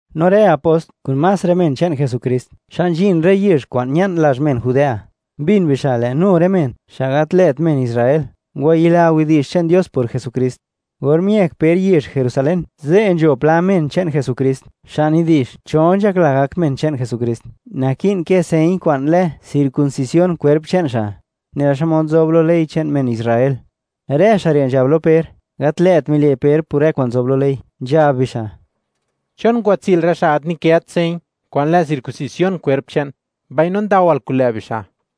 No rë apost, kun más rë men che'n Jesukrist xa' nzhin rë yezh kwa'n ña'n lazh men Judea, mbin bixa' lë' nu rë men, xa' gat lë't men Israel, ngwayila widi'zh che'n Dios por Jesukrist. Or miëk Per yezh Jerusalén, ze' nzho pla men che'n Jesukrist xa' nidi'zh, cho nzhakla gak men che'n Jesukrist, naki'n kë señ kwa'n lë circuncisión kwerp che'n xa', nela xmod nzob lo ley che'n men Israel. Rë xa' re' nzhab lo Per, gat lë't mile' Per por rë kwa'n nzob lo ley, nzhab bixa': ―¿Chon ngwatsi'l rë xa' gat nikët señ kwa'n lë circuncisión kwerp che'n, mbaino ndawal kun lë' bixa'?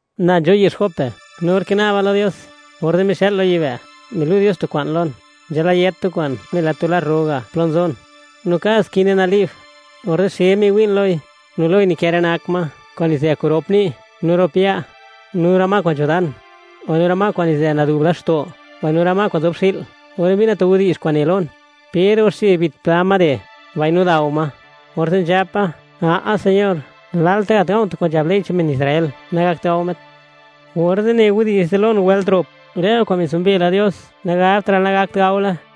―Na nzho' yezh Jope, no or kina'ba lo Dios, orze' mixa'l lo yibë', milu' Dios tu kwa'n lon, nzhalayët tu kwa'n nela tu lar ro ga' plo nzon, no kad skine nali'b. Orze' xe miwi'n loi, no loi nikë rë nak ma kwa'n nizë kun rop ni' no rop ya', no rë ma kwa'n nzho dan, mbaino rë ma kwa'n nizë nadu'b laxto', no rë ma kwa'n nzob xi'l. Orze' mbina tu widi'zh kwa'n ne lon: “Per, ngwaxche bit pla ma re', mbaino dao ma.” Orze' nzhapa: “¡A'a Señor, lalta' gat ga̱u̱ tu kwa'n nzhab ley che'n men Israel nagakt gao met!” Orze' ne widi'zh ze' lon wëlt rop: “Rë kwa'n mitsumbe la Dios, nagabtra'l nagakt gaole.”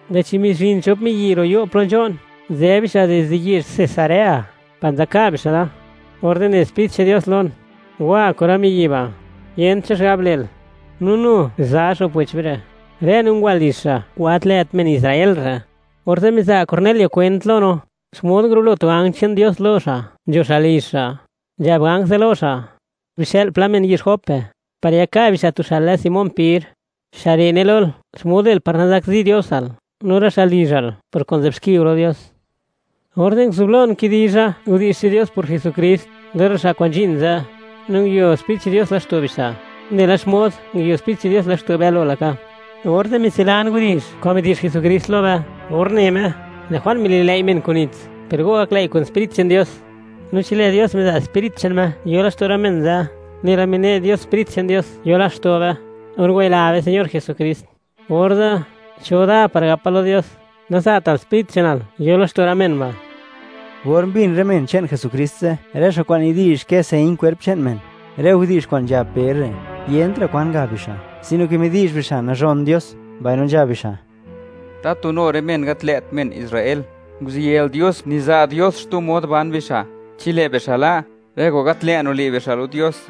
lë'chi mizhin chon miyi' ro' yo' plo nzho'n. Nzë bixa' dizde yezh Cesarea par nzaka' bixa' da. Orze' ne Sprit che'n Dios lon: “Wa kun rë miyi' ba', yent cho xigab le'l.” No nu za xo'p wech be re', rë no ngwa lizh xa' kwa'n gat lë't men Israel re'. Orze' miza' Cornelio kwent lo no, xmod ngurulo tu ganj che'n Dios lo xa', nzho xa' lizh xa', nzhab ganj ze' lo xa': “Bixë'l pla men yezh Jope, par yaka' bixa' tu xa' lë Simón Per, xa' re' ne lol, xmod le'l par nazakzi Diosal no rë xa' lizhal por kwa'n nzë'b xki go lo Dios.” Orze' nguzublon kidizha widi'zh che'n Dios por Jesukrist lo rë xa' kwa'n nzhin ze', no nguio Sprit che'n Dios laxto' bixa', nela xmod nguio Sprit che'n Dios laxto' be galo laka. Orze' mitsilan widi'zh kwa'n midi'zh Jesukrist lo be or ne Me: “Lë' Juan mililëi' men kun nits, per go gaklëi' kun Sprit che'n Dios.” No chi lë' Dios miza' Sprit che'n Me, yo laxto' rë men ze', nela mine' Dios Sprit che'n Dios yo laxto' be, or ngwayila be Señor Jesukrist, orze', ¿cho da par gapa lo Dios: “Naza'tal Sprit che'nal yo laxto' rë men ba'”? Or mbin rë men che'n Jesukrist ze', rë xa' kwa'n nidi'zh kë señ kwerp che'n men, rë widi'zh kwa'n nzhab Per re', yentra' kwa'n ngab bixa', sino ke midi'zh bixa', nazhon Dios, mbaino nzhab bixa': ―¡Tatu nu rë men gat lë't men Israel, nguziyël Dios, niza' Dios xtu mod ban bixa' chi lë' bixa' la' rë kwa'n gat lë' nile' bixa' lo Dios!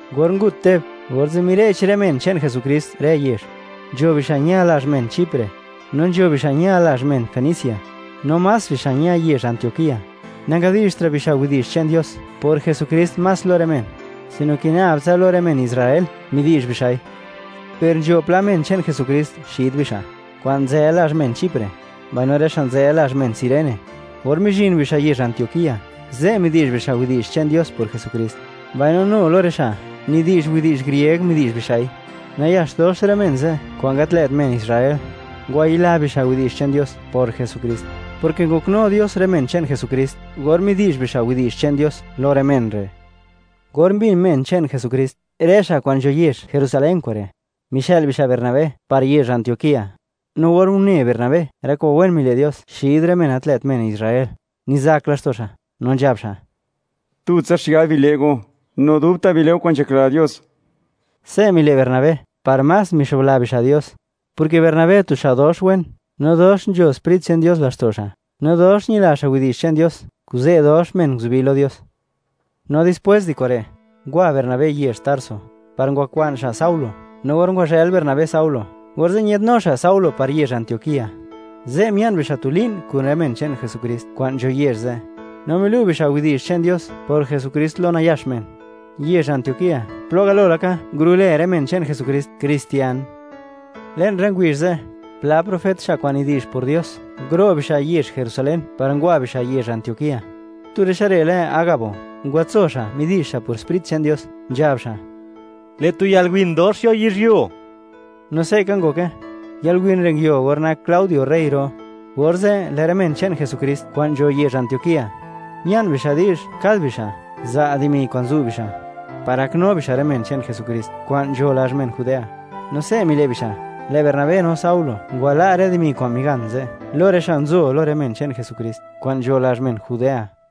Or ngut Teb, orze' mire'ch rë men che'n Jesukrist rë yezh. Nzho bixa' ña lazh men Chipre, no nzho bixa' ña lazh men Fenicia, no más bixa' ña yezh Antioquía. Nangadi'zhtra' bixa' widi'zh che'n Dios por Jesukrist más lo más rë men, sino ke nab tsa lo rë men Israel midi'zh bixa'i. Per nzho pla men che'n Jesukrist xid bixa' kwa'n nzë lazh men Chipre, mbaino rë xa' nzë lazh men Cirene. Or mizhin bixa' yezh Antioquía, ze' midi'zh bixa' widi'zh che'n Dios por Jesukrist, mbaino nu lo rë xa' nidi'zh widi'zh grieg midi'zh bixa'i. Nayax dox rë men ze' kwa'n gat lë't men Israel, ngwayila bixa' widi'zh che'n Dios por Jesukrist, porke ngoknu Dios rë men che'n Jesukrist, or midi'zh bixa' widi'zh che'n Dios lo rë men re'. Or mbin men che'n Jesukrist, rë xa' kwa'n nzho yezh Jerusalén kure', mixë'l bixa' Bernabé par yezh Antioquía. No or une Bernabé, rë kwa'n wen nile' Dios xid rë men gat lë't men Israel, nizak laxto' xa', no nzhab xa': ―Tutsa xigab bile' go, no dubta' bile' go kwa'n nzhakla Dios. Se' mile' Bernabé par más mixobla bixa' Dios, porke Bernabé, tu xa' dox wen, no dox nzho Sprit che'n Dios laxto' xa', no dox ñila xa' widi'zh che'n Dios, kuze' dox men nguzubi lo Dios. No dispwés di kure', ngwa Bernabé yezh Tarso, par ngwakwa'n xa' Saulo. No or ngwazhël Bernabé Saulo, orze' ñë'dnu xa' Saulo par yezh Antioquía. Ze' mia'n bixa' tu li'n kun rë men che'n Jesukrist kwa'n nzho yezh ze', no milu' bixa' widi'zh che'n Dios por Jesukrist lo nayax men. Yezh Antioquía, plo galo laka ngurulë rë men che'n Jesukrist, kristian. Le'n rë ngubizh ze', pla profet, xa' kwa'n nidi'zh por Dios, nguro' bixa' yezh Jerusalén, par ngwa bixa' yezh Antioquía. Tu rë xa' re' lë Agabo, ngwatso xa' midi'zh xa' por Sprit che'n Dios, nzhab xa': “Lë' tu yalwin dox yo yizhyuo”, no se'ka ngoke. Yalwin re' nguio or nak Claudio rey ro. Orze', lë' rë men che'n Jesukrist kwa'n nzho yezh Antioquía, mia'n bixa' di'zh kad bixa' za' dimi kwa'n zu' bixa', par gaknu bixa' rë men che'n Jesukrist kwa'n nzho lazh men Judea. No se' mile' bixa', lë' Bernabé no Saulo ngwala' rë dimi kwa'n migan ze' lo rë xa' nzo lo rë men che'n Jesukrist kwa'n nzho lazh men Judea.